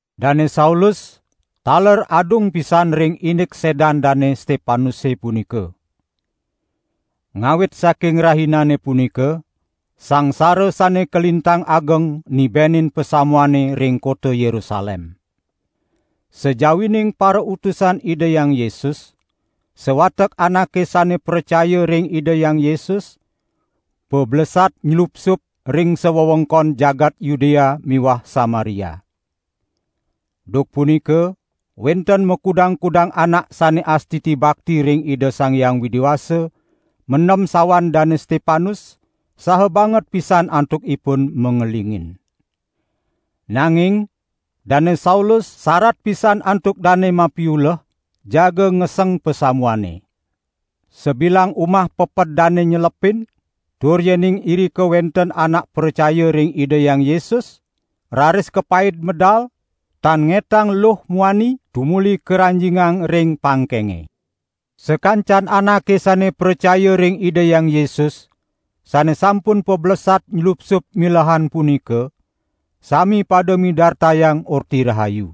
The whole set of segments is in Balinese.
Dane Saulus taler adung pisan ring indik sedan Dane Stepanuse punika. Ngawit saking rahinane punika sangsara sane kalintang ageng nibenin pasamuane ring kota Yerusalem. Sajawining parautusan Ida Hyang Yesus, sawatek anake sane pracaya ring Ida Hyang Yesus pablesat nylupsup ring sawewengkon jagat Yudea miwah Samaria. Duk punika wenten makudang-kudang anak sane astiti bakti ring Ida Sang Hyang Widi Wasa mendem sawan Dane Stepanus, saha banget pisan antukipun mangelingin. Nanging Dane Saulus sarat pisan antuk dane mapiuleh jaga ngeseng pasamuane. Sabilang umah peped dane nyelepin, tur yening irika wenten anak pracaya ring Ida Hyang Yesus, raris kapaid medal, tan ngetang luh muani, tumuli karanjingang ring pangkenge. Sakancan anake sane pracaya ring Ida Hyang Yesus, sane sampun pablesat nylupsup milehan punika, sami pada midartayang Orti Rahayu.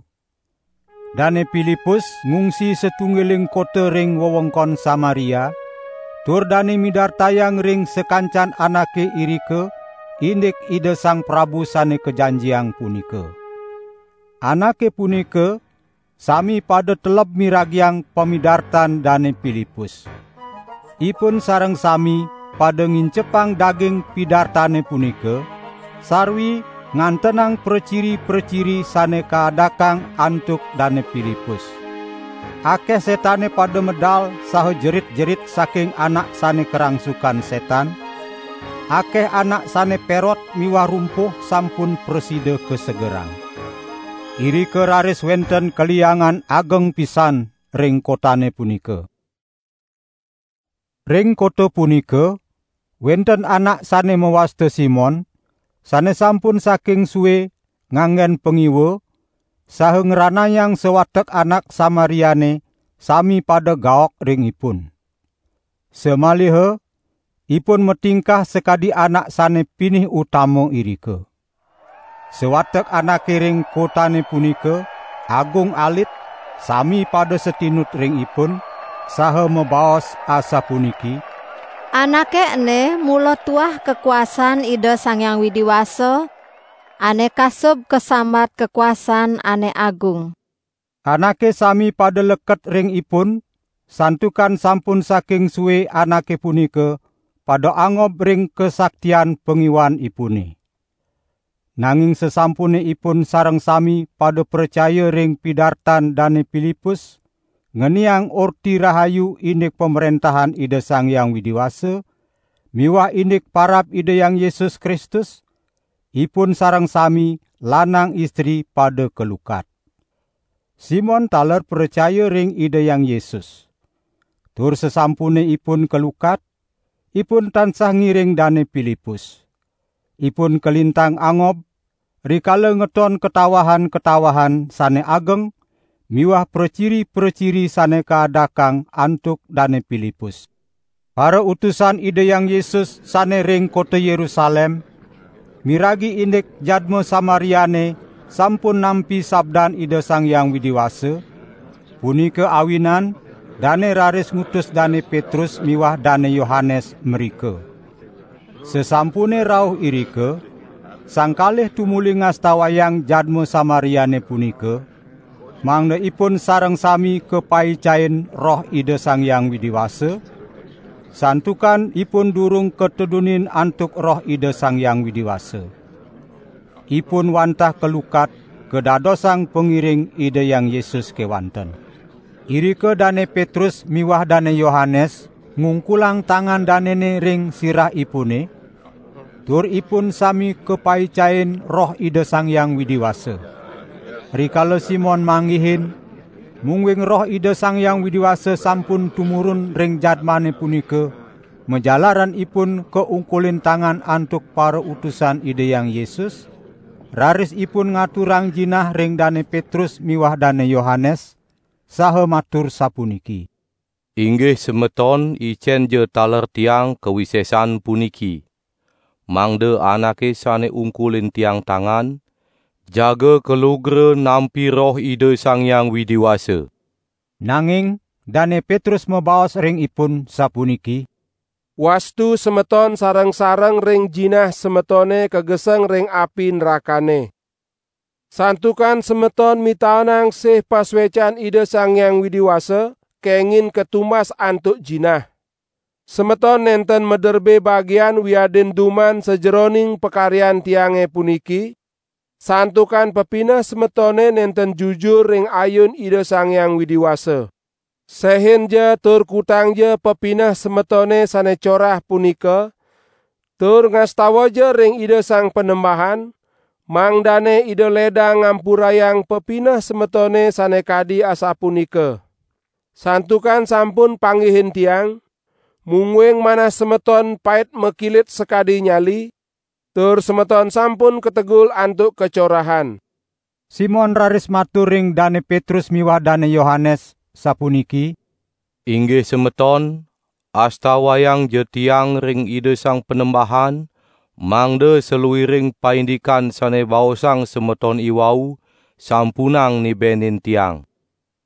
Dane Pilipus ngungsi satunggiling kota ring wewengkon Samaria, tur dane midartayang ring sakancan anake irika indik Ida Sang Prabu Sane Kajanjiang punika. Anake punika sami pada teleb miragiang pamidartan Dane Pilipus. Ipun sareng sami pada ngincepang daging pidartane punika, sarwi ngantenang praciri-praciri sane kaadakang antuk Dane Pilipus. Akeh setane pada medal saha jerit-jerit saking anak sane karangsukan setan; akeh anak sane perot miwah rumpuh sampun prasida kasegerang. Irika raris wenten kaliangan ageng pisan ring kotane punika. Ring kota punika wenten anak sane mawasta Simon, sane sampun saking sue nganggen pangiwa saha ngranayang sawatek anak Samariane sami pada gaok ring ipun. Samaliha ipun matingkah sakadi anak sane pinih utama irika. Sawatek anake ring kotane punika, agung alit, sami pada satinut ring ipun, saha mabaos asapuniki: "Anake ene mula tuah kakuasaan Ida Sang Hyang Widi Wasa, ane kasub kasambat kakuasaan ane agung." Anake sami pada leket ring ipun santukan sampun saking sue anake punika pada angob ring kasaktian pangiwanipune. Nanging sasampune ipun sareng sami pada pracaya ring pidartan Dane Pilipus ngeniang Orti Rahayu indik Pamrentahan Ida Sang Hyang Widi Wasa miwah indik parab Ida Hyang Yesus Kristus, ipun sareng sami, lanang istri pada kalukat. Simon taler pracaya ring Ida Hyang Yesus. Tur sasampune ipun kalukat, ipun tansah ngiring Dane Pilipus. Ipun kalintang angob rikala ngeton katawahan-katawahan sane ageng miwah praciri-praciri sane kaadakang antuk Dane Pilipus. Parautusan Ida Hyang Yesus sane ring kota Yerusalem miragi indik jadma Samariane sampun nampi sabdan Ida Sang Hyang Widi Wasa, punika awinan dane raris ngutus Dane Petrus miwah Dane Yohanes mrika. Sasampune rauh irika, sang kalih tumuli ngastawayang jadma Samariane punika mangda ipun sareng sami kapaicain Roh Ida Sang Hyang Widi Wasa, santukan ipun durung katedunin antuk Roh Ida Sang Hyang Widi Wasa. Ipun wantah kalukat kadadosang pangiring Ida Hyang Yesus kewanten. Irika Dane Petrus miwah Dane Yohanes ngungkulang tangan danene ring sirahipune, tur ipun sami kapaicain Roh Ida Sang Hyang Widi Wasa. Rikala Simon manggihin, mungguing Roh Ida Sang Hyang Widi Wasa sampun tumurun ring jadmane punika majalaran ipun kaungkulin tangan antuk parautusan Ida Hyang Yesus, raris ipun ngaturang jinah ring Dane Petrus miwah Dane Yohanes, saha matur sapuniki: "Inggih semeton icenja taler tiang kawisesan puniki. Mangda anake sane ungkulin tiang tangan, jaga kalugra nampi Roh Ida Sang Hyang Widi Wasa." Nanging Dane Petrus mabaos ring ipun sapuniki: "Wastu semeton sareng-sareng ring jinah semetone kageseng ring api nrakane. Santukan semeton mitaenang sih pasuecan Ida Sang Hyang Widi Wasa kengin katumbas antuk jinah. Semeton nenten maderbe bagian wiadin duman sajeroning pakaryan tiange puniki, santukan pepineh semetone nenten jujur ring ayun Ida Sang Hyang Widi Wasa. Sehinja tur kutangja pepineh semetone sane corah punika, tur ngastawaja ring Ida Sang Panembahan, mangdane Ida ledang ngampurayang pepineh semetone sane kadi asapunika. Santukan sampun panggihin tiang, mungguing manah semeton pait makilit sakadi nyali, tur semeton sampun kategul antuk kacorahan." Simon raris matur ring Dane Petrus miwah Dane Yohanes, sapuniki: "Inggih semeton, astawayangja tiang ring Ida Sang Panembahan mangda saluiring paindikan sane baosang semeton iwau, sampunang nibenin tiang."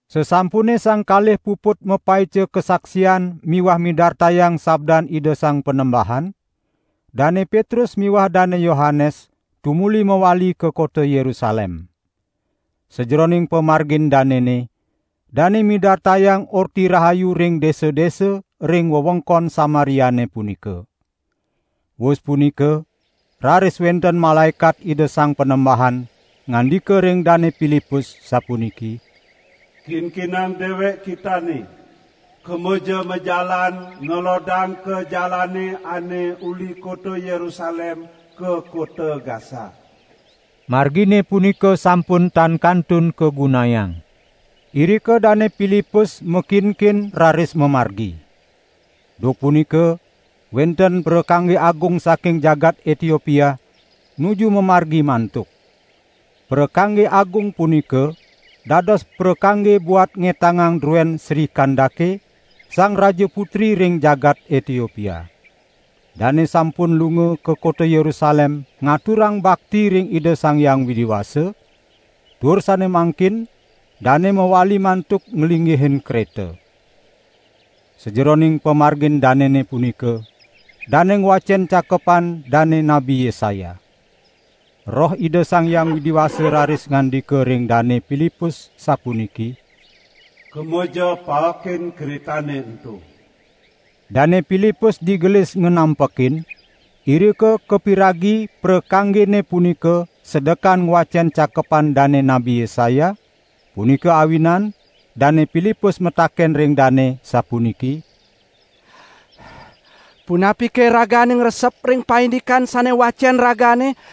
Sasampune sang kalih puput mapaica kasaksian miwah midartayang sabdan Ida Sang Panembahan, Dane Petrus miwah Dane Yohanes tumuli mawali ka kota Yerusalem. Sajeroning pamargin danene, dane midartayang Orti Rahayu ring desa-desa ring wewengkon Samariane punika. Wus punika raris wenten malaekat Ida Sang Panembahan ngandika ring Dane Pilipus sapuniki: "Kinkinang dewek kitane, kemaja majalan ngalodang ka jalane ane uli kota Yerusalem ka kota Gasa." (Margine punika sampun tan kantun kagunayang.) Irika Dane Pilipus makinkin raris mamargi. Duk punika wenten prakangge agung saking jagat Etiopia nuju mamargi mantuk. Prakangge agung punika, dados prakangge buat ngetangang druen Sri Kandake, Sang Raja Putri ring jagat Etiopia. Dane sampun lunga ka kota Yerusalem ngaturang bakti ring Ida Sang Hyang Widi Wasa, tur sane mangkin dane mawali mantuk nglinggihin kreta. Sajeroning pamargin danene punika, dane ngwacen cakepan dane Nabi Yesaya. Roh Ida Sang Hyang Widi Wasa raris ngandika ring Dane Pilipus, sapuniki: "Kemaja paekin kretane ento!" Dane Pilipus digelis nganampekin, irika kapiragi prakanggene punika sedekan ngwacen cakepan dane Nabi Yesaya, punika awinan Dane Pilipus mataken ring dane sapuniki: "Punapike ragane ngresep ring paindikan sane wacen ragane?"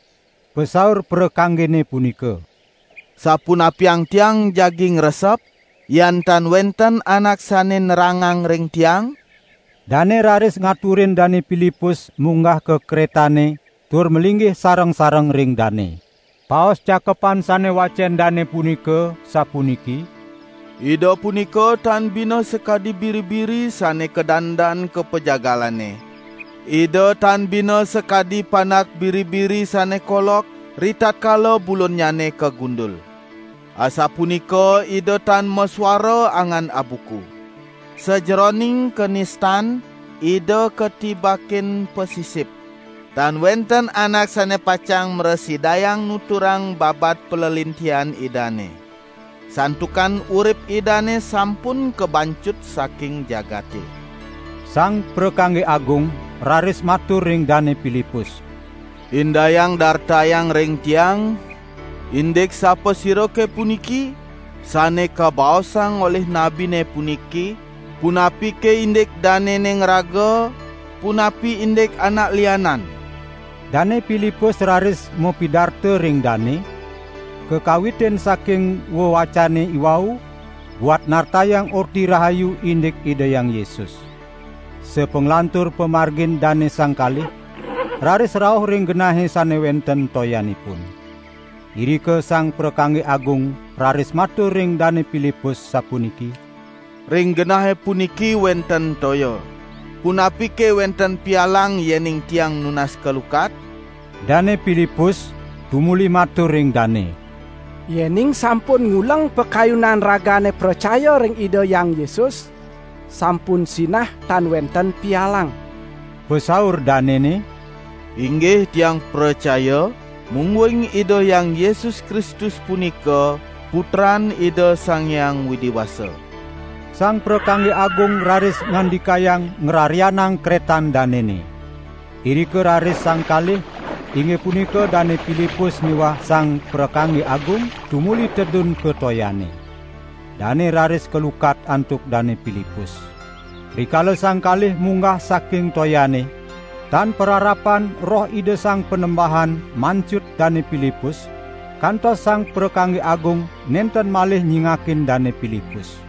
Pasaur prakanggene punika: "Sapunapiang tiang jagi ngresep, yan tan wenten anak sane nerangang ring tiang?" Dane raris ngaturin Dane Pilipus munggah ka kretane tur malinggih sareng-sareng ring dane. Paosan cakepan sane wacen dane punika sapuniki: "Ida punika tan bina sakadi biri-biri sane kadandan ka pajagalane. Ida tan bina sakadi panak biri-biri sane kolok ritatkala bulunnyane kagundul. Asapunika Ida tan masuara angan abuku. Sajeroning kanistan, Ida katibakin pasisip. Tan wenten anak sane pacang mrasidayang nuturang babad palelintihan Idane. Santukan urip Idane sampun kabancut saking jagate." Sang prakangge agung raris matur ring Dane Pilipus: "Indayang dartayang ring tiang, indik sapasirake puniki, sane kabaosang olih nabine puniki? Punapike indik danene ngraga, punapi indik anak lianan?" Dane Pilipus raris mapidarta ring dane, kakawitin saking wewacene iwau, buat nartayang Orti Rahayu indik Ida Hyang Yesus. Sapanglantur pamargin dane sang kalih, raris rauh ring genahe sane wenten toyanipun. Irika sang prakangge agung raris matur ring Dane Pilipus, sapuniki: "Ring genahe puniki wenten toya. Punapike wenten pialang yening tiang nunas kalukat?" [ Dane Pilipus tumuli matur ring dane: "Yening sampun nguleng pakayunan ragane pracaya ring Ida Hyang Yesus, sampun sinah tan wenten pialang." Pasaur danene: "Inggih tiang pracaya mungguing Ida Hyang Yesus Kristus punika putran Ida Sang Hyang Widi Wasa."] Sang prakangge agung raris ngandikayang ngrarianang kretan danene. Irika raris sang kalih, inggih punika Dane Pilipus miwah sang prakangge agung, tumuli tedun ka toyane. Dane raris kalukat antuk Dane Pilipus. Rikala sang kalih munggah saking toyane, tan pararapan Roh Ida Sang Panembahan mancut Dane Pilipus, kantos sang prakangge agung nenten malih nyingakin Dane Pilipus.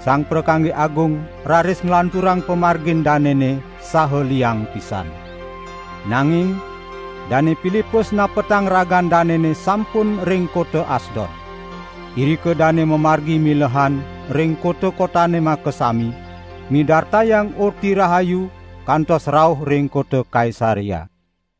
Sang prakangge agung raris nglanturang pamargin danene saha liang pisan. Nanging Dane Pilipus napetang ragan danene sampun ring kota Asdod. Irika dane mamargi milehan ring kota-kotane makasami, midartayang Orti Rahayu kantos rauh ring kota Kaisarea.